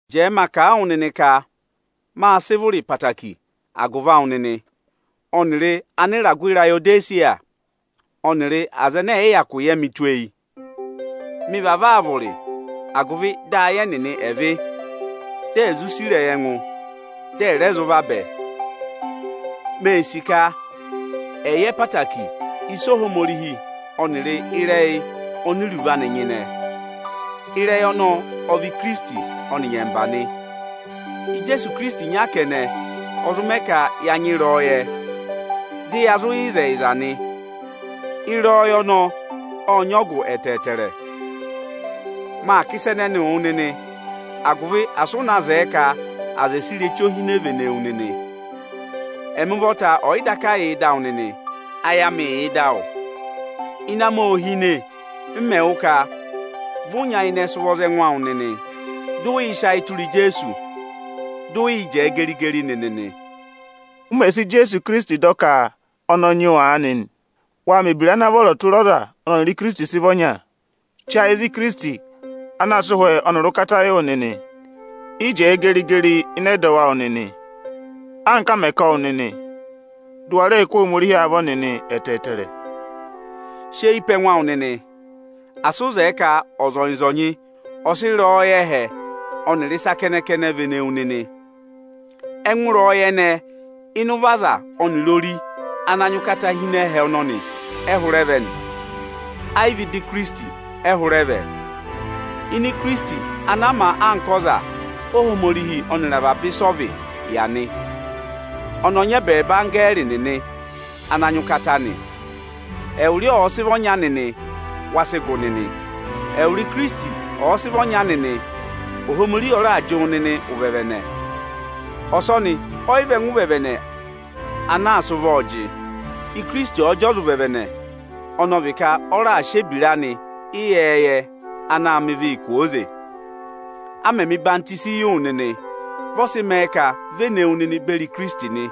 Jẹẹ ma kà a wụ nịnị ka mâ sị vụrị ẹtẹẹtẹrẹ agụvị awụ nịnị ọnịrị Anịragụ Irayodesiya ọnịrị aza ẹnẹ ẹ̀ yị hyakụ yẹ mị tụ́ eyi. Mị vavọọ aa vụrị agụvị ayị ẹnịnị ẹ̀ vị́, di è zụ sì ịrẹyị ẹngụ, dị ẹ̀ rẹ zụ vabẹ. Mee sì ka ẹ̀ yẹ ẹtẹẹtẹrẹ ịsa Ohomorihi vị ọnịrị ịrẹyị oni iruvo anị nyịnẹ. Ịrẹyị ọnọọ ọ vị Ikirisiti ọnị nyẹmba nị. Ijeesu Ikirisiti ịnya kẹnẹ ọ zụ mẹ ka ya nyị ịrẹyọyẹ dị ya zụ yẹ ịzẹyịza nị. Ịrẹyọyẹ ọnọọ ọ́ọ nyị ọgụ ẹtẹẹtẹrẹ. Maa kà ịsa ẹnẹnịị wụ nịnị, agụvị asị ụ na zẹẹ ka ọza ọ̀ sị ireche ohine vene wu nịnị. Ẹmị ụvọta ẹ̀ yị daka yà ịdị awụ nịnị, ayị amị yà ịdị awụ nịnị. Ịnẹ amị ô hine m mẹ̀ wụ́ ka vị ụ nyayịnẹ sị ụvọ za ẹngụ awụ nịnị, dị ụ yị sị ayị tụra Ijeesu, dị ụ yị jẹẹ geri-geri nịnị nị. Ụ mẹ̀ sị Ijeesu Ikirisiti dọ ka ọnị ọ nyị wụ nịnị aanị nị, waa mẹ̀ ebira ana vọrọ tụra ọza ọnị ọnịrị Ikirisiti sị vị ọnya. Che ayị za Ikirisiti ana sị ụhwẹ ọnịrị ụkata yị wụ nịnị! Yị jẹẹ geri-geri ịnị ẹdọwụ awụ nịnị, anka a mẹ̀ sị zụ̀ wụ nịnị; dị ụ wa rẹẹ kụ́ Ohomorihi avọ nịnị ẹtẹẹtẹrẹ! Sị eyi pe ẹngụ awụ nịnị! Asị ụ zẹẹ ka ọzọnyị-ọzọnyị ọ̀ sị ịrẹyọyẹ ẹhẹ ọnịrị ịsa kẹnẹ-kẹnẹ vene wu nịnị! Ẹngụ ịrẹyọyẹ ẹnẹẹ ịnị ụvọ aza ọnịrị ori ana nyị ụkata hi ịnị ẹhẹ ọnọnị ẹ hụrẹ vẹ nị. Ayị vị ịda Ikirisiti ẹ hụrẹ vẹ. Ini Ikirisiti ana a ma anka ọzarẹyịrẹsụ, Óhomorihi ọnịrị avaba ịsị ọ vị yà nị. Ọnị ọ nyị ẹbẹẹba anggẹẹrị nịnị ana nyị ụkata nị. Ẹwụ rị ọ ọ̀ọ sị vị ọnya nịnị, wa sị gụ nịnị. Ẹwụrị Ikirisiti ọ̀ọ sị vị ọnya nịnị, Ohomorihi ọ raà jị wụ nịnị ụvẹvẹnẹ; ọsọnị ọyị vị ẹngụ ụvẹvẹnẹ ana aā sị ụvọọ jị. Ikirisiti ọ̀ọ jị ọza ụvẹvẹnẹ, ọnị ọ vị ka ọ raà sị ebira anị ịyẹẹyẹ anaā mẹ ịvị kwooze. A mẹ mẹ̀ ọyịhwọzenyi yị wụ nịnị, vị ọ sị mẹẹ ka vị e ne wu nịnị beri Ikirisiti nị;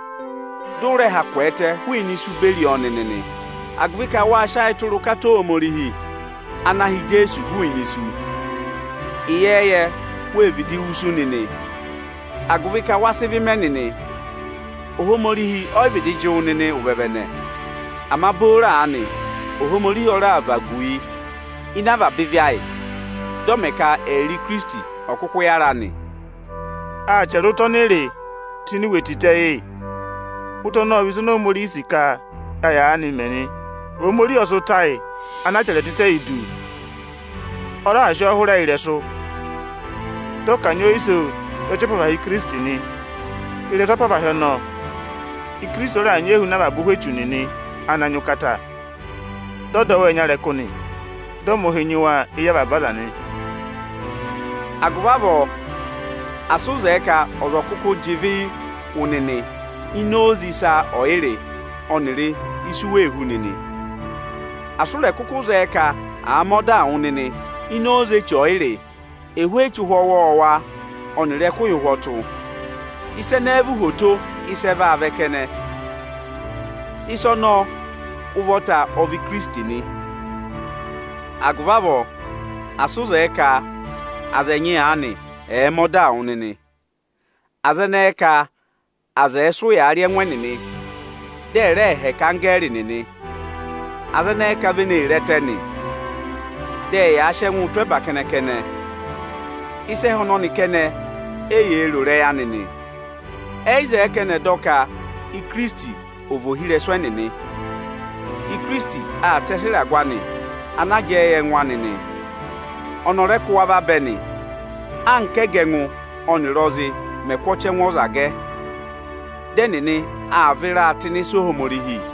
dị ụ rẹ ha kwẹẹtẹ hụụnị isu beri ọọ nịnị nị, agụvị ka wáa sị ayị tụra ụkata Ohomorihi ana ha Ijeesu hụụnị isu. Ịyẹẹyẹ, wée vịdị wusu nịnị, agụvị ka wa sị ịvị mẹ nịnị, Ohomorihi ọ yị vịdị jị wụ nịnị ụvẹvẹnẹ. Ama booro aanị Ohomorihi ọ raà vagu yi ịnị avaba ịvị ayị, dị ọ mẹ ka ẹyịrị Ikirisiti ọ̀ kụkụ yára nị. Â chẹrẹ ụta ọnị ị rị tụ́ ini iwe tịtẹ yị yị. Ụta ọnọọ ọ vị oyisì Ohomorihi ọnị o sì ka ya yaanịị mẹ nị. Ohomorihi ọ sị ụta ayị ana a chẹrẹ tịtẹ yị du. Ọ raà sị ọọ hụrẹ yị ịrẹsụ, dị ọ kanyị ọọ iso za ọchị apavahị Ikirisiti nị. Ị́rẹsụ apavahị ọnọọ, Ikirisiti ọ raà nyị ehuna avaba ụhwẹ echu nịnị ana nyị ụkata, dị ọ dọ wa ẹnya ịrẹkụ, dị ọ mẹ̀ ụhị nyị wa éyi avaba aza nị. Agụvị avọọ asị ụ zẹẹ ka ọza ọ̀ kụkụụ jị ịvịị wụ nịnị ini oze ịsọyịrị ọnịrị isu wee hú nịnị. Asị ụ rẹ kụkụ zẹẹ ka àa mẹ ọdaa wụ nịnị ini oze eche ọyịrị, ẹhụụ eche ụhwẹ ọwọọwa ọnịrị ẹkụhị ụhwọtụ. Ịsa ẹnẹẹ vị uhwoto ịsị ẹ vaa vẹ kẹnẹ. Ịsa ọnọọ ụvọta ọ vị Ikirisiti nị. Agụvị avọọ, asị ụ zẹẹ ka aza ẹnyị aanị ẹ̀ẹ mẹ ọdaa wụ nịnị. Aza ẹnẹẹ ka aza ẹ̀ẹ sị ụyaa rị ẹngụ ẹnịnị, dị ẹ̀ rẹẹ hẹkẹ anggẹẹrị nịnị. Aza ẹnẹẹ ka vị eni ee re ẹtẹ nị. Dị ẹyaa sị ẹngụụ tụ́ ẹba kẹnẹ-kẹnẹ. Ịsa ẹhẹ ọnọnị kẹnẹ éyee ro ịrẹyị anị nị. Ẹyị zẹẹ ka ẹnị ẹ̀ dọ ka Ikirisiti ọ̀ vị ohirẹsụ ẹnịnị. Ikirisiti aa tẹsị ịragụ anị ana jẹẹ yị ẹngụ anị nị. Ọnị ọ rẹ kụ́ wa vabẹ, anka ẹgẹ ẹngụ ọnịrị ọzị mẹ̀ kụ́ ọchẹngụ ọza gẹ nị. Dị ẹnịnị aa vịraa tụ́ ịnị ịsa Ohomorihi.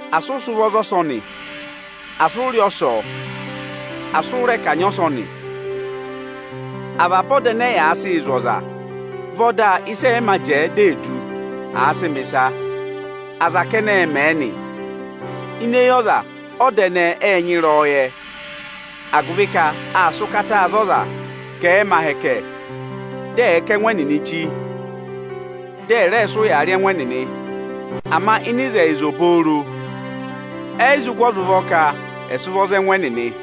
Asị ụ sị ụvọ za ọsọnị, asị ụ rị ọsọọ, asị ụ rẹ kanyị ọsọnị? Avaba ọda ẹnẹẹ ẹnẹ ẹyaa sịị zụ̀ aza vị ọda ịsị ẹ̀ yị mā jẹẹ dị è du, àa sịị mẹ̀ ịsa. Aza kẹnẹ ẹ mẹ̀ ẹ nị. Ini eyi ọza, ọda ẹnẹẹ ẹ́ẹ nyị ịrẹyọyẹ, agụvị ka aa sị ụkataa za ọza ka ẹ̀ẹ mẹ ahẹkẹ, dị ẹ̀ kà ẹngụ ẹnịnị chí, dị ẹ̀ rẹ sị ụya rị ẹngụ ẹnịnị. Ama ịnị ịzẹyịza obooro, ẹyị zụ gụ ọza ụvọ ka ẹ̀ sị ụvọ za ẹngụ ẹnịnị.